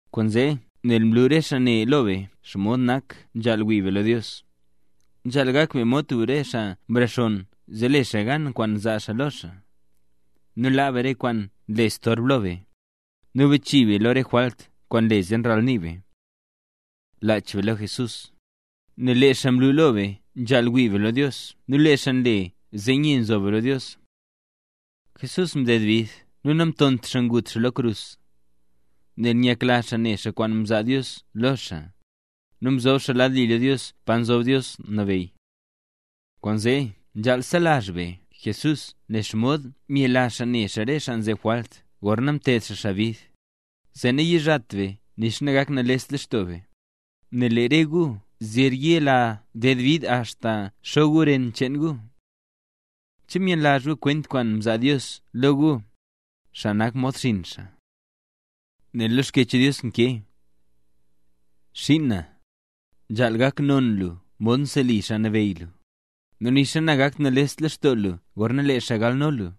Kwaanzee, nel mlu re xaa ne lo be xomod nak nzhaal wii be lo Dios, nzhaal gak be mod tub xaa nrexonn zee le xaa gan kwaan zaa xaa lo xaa, nu laa be rese kwaan nle storb lo be, nu bachii be lo re jwalt kwaan nle zee ralnii be. Lach be lo Jesús, nel lee xaa mlu lo be xomod nzhaal wii be lo Dios nu lee xaa nle zee nye nzo be lo Dios. Jesús mded bid nu namtont xaa ngut xaa lo krus, nel nyakla xaa ne xaa kwaan mzaa Dios lo xaa; nu mzob xaa lad li lo Dios pa nzob Dios nabeyy. Kwaanzee nzhaal selazh be Jesús nen xomod myela xaa ne xaa re xaa nzeb jwalt gorna mted xaa xaa bid, zee nayizhat be nixa nagaknalest lextoo be, nel lee re gu zer yela ded bid axta xo gu ren cheen gu. ¿Che myenlazhla gu kwent kwaan mzaa Dios lo gu, xaa nak mod xinn xaa? Nel lo Xkyech Dios nkee: Xiin na, nzhaal gak non lo lu mod nseli Xaa Nabeyy lu, nu nixa nagakt nales lextoo lu gorna lee xaa galno lu.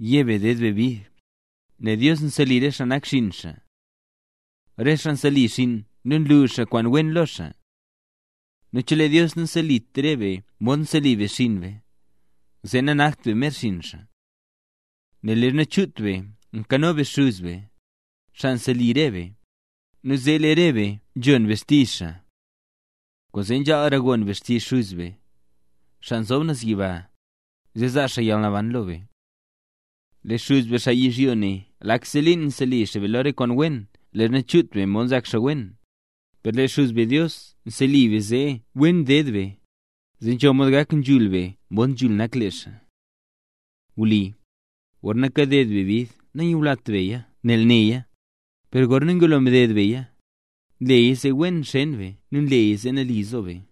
Ye be ded be bid, nel Dios nseli re xaa nak xinn xaa. Rese xaa nseli xinn nu nlu xaa kwaan wen lo xaa. Nu chelee Dios naselit re be modxa nseli be xinn be, zee nanakt be mer xinn xaa. Nel leezha chut be mkano be xuz be, xaa nseli re be, nu zee lee re be nzhon be xtizh xaa. Kwaanzee nzhaalra gon be xtizh Xuz be, xaa nzob naz yiba, zee zaa xaa yalnaban lo be. Lee xuz be, xaa yizhyo ne lakse liin nseli xaa be lo re kwaan wen leezha chut be mod nzak xaa wen; per lee xuz be Dios nseli be zee wen ded be, zee nzho mod gak nzhul be mod nzhul nak lee xaa. Wli, gorna kaded be bid nanyulat beya nel neya; per gorna ngulo mded beya, nleya zee wen xeen be nu nleya zee nali zo be.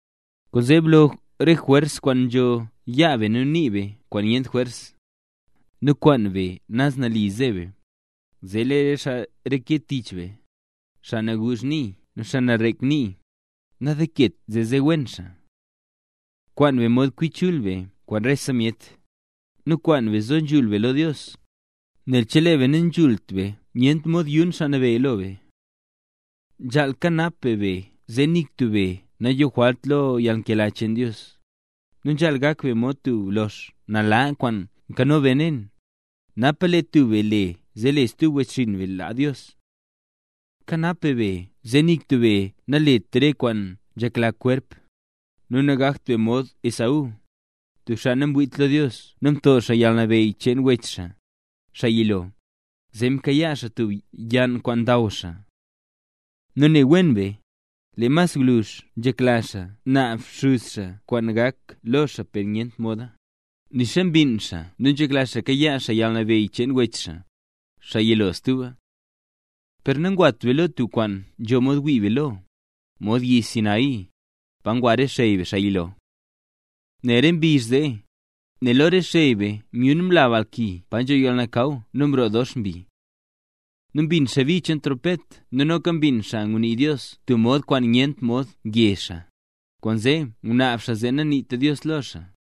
Kwaanzee, blo re jwers kwaan nzho yaa be nu nii be kwaan nyent jwers, nu kwaan be naz nali ze be, zee lee re xaa reke tich be, xaa naguuzh nii nu xaa narek nii, nandenket zee ze wen xaa. Kwaan be mod kwi chul be kwaan rese myet; nu kwaan be zo be nzhul lo Dios, nel chelee be nanzhult be nyent mod yun Xaa Nabeyy lo be. Nzhaal kanap be be zee nik tub be nayojwalt lo yalnkela cheen Dios, nu nanzhaalt gak be mod tub lox nala kwaan nkano benen, napa lee tub be le zee lee stub wechxinn be laa Dios. Kanap be be zee nik tub be nalet re kwaan nzhekla kwerp, nu nagakt be mod Esaú, tub xaa namwiit lo Dios nu mto xaa yalnabeyy cheen wech xaa, xaa yilo, zee mka xaa tub yann kwaan ndaw xaa. Nu ne wen be, lee mas gwluzh nzhekla xaa naab xuz xaa kwaan gak lo xaa per nyentra moda, nixa mbinn xaa nu nzhekla xaa kayaa xaa yalnabeyy cheen wech xaa, xaa yilo stuba. Per nangwat be lo tub kwaan nzho mod wii be lo, mod yi Sinaí, pa ngwa re xey be, xaa yilo. Nel re mbizh zee, lee lo re xey be myun mla balki pa nzho yalnakaw nu mroo dox mbi. Nu mbin xaa bi cheen trompet nu noka mbin xaa ngunii Dios tub mod kwaan nyent mod ngye xaa, kwaanzee mnaab xaa zee naniitra Dios lo xaa.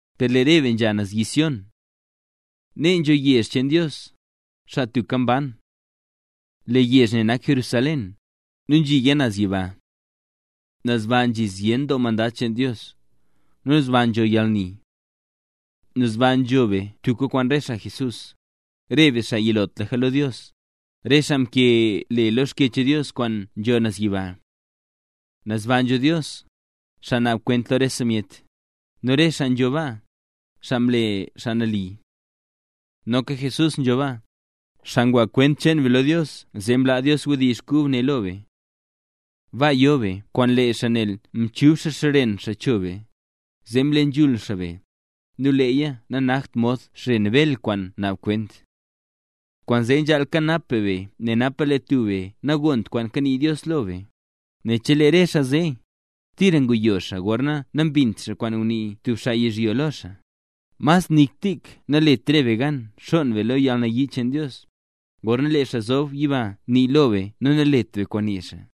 Per lee re be nzha naz yi Sión. Nee nzho yezh cheen Dios, xaa tubka mban. Lee yezh ne nak Jerusalén, nu nzhiya naz yiba. Naz ba nzhi zyen doo mandad cheen Dios, nu naz ba nzho yalni. Naz ba nzho be tubka kwaan re xaa Jesús, re be xaa yilotlaka lo Dios, re xaa mkee le lo Xkyech Dios kwaan nzho naz yiba. Naz ba nzho Dios, xaa naab kwent lo rese myet, nu re xaa xaa nzho baa, xaa mle xaa nali. Noka Jesús nzho baa, xaa ngwa kwent cheen be lo Dios zee mlaa Dios wdizh kub ne lo be. Baa yo be kwaan lee xaa nel mchub xaa xren xaa cho be, zee mle nzhul xaa be, nu leeya nanakt mod xren Bel kwaan naab kwent. Kwaanzee nzhaal kanap be be napa lee tub be nagont kwaan kanii Dios lo be, nel chelee re xaa zee, tira nguyo xaa gorna nambint xaa kwaan ngunii tub xaa yizhyo lo xaa, mas nik tik nalet re be gan xonn be lo yalnayii cheen Dios, gorna lee xaa nzob naz yiba nii lo be nu nalet be kwaan nii xaa.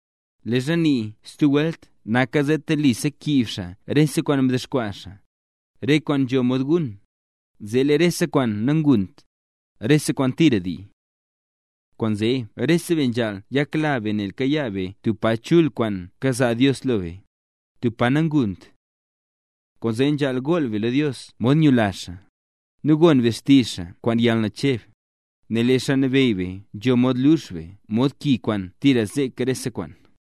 Leezha nii “stub welt” naka zee telisa kiib xaa rese kwaan mdexkwaa xaa, re kwaan nzho mod gun, zee lake rese kwaan nangunt, rese kwaan tira ndii. Kwaanzee rese be nzhaal nyakla be nel kakayaa be tub pa chul kwaan kazaa Dios lo be, tub pa nangunt. Kwaanzee nzhaal gool be lo Dios mod nyula xaa, nu gon be xtizh xaa kwaan yalnacheb, nel lee Xaa Nabeyy be nzho mod lux be mod ki kwaan tira zek rese kwaan.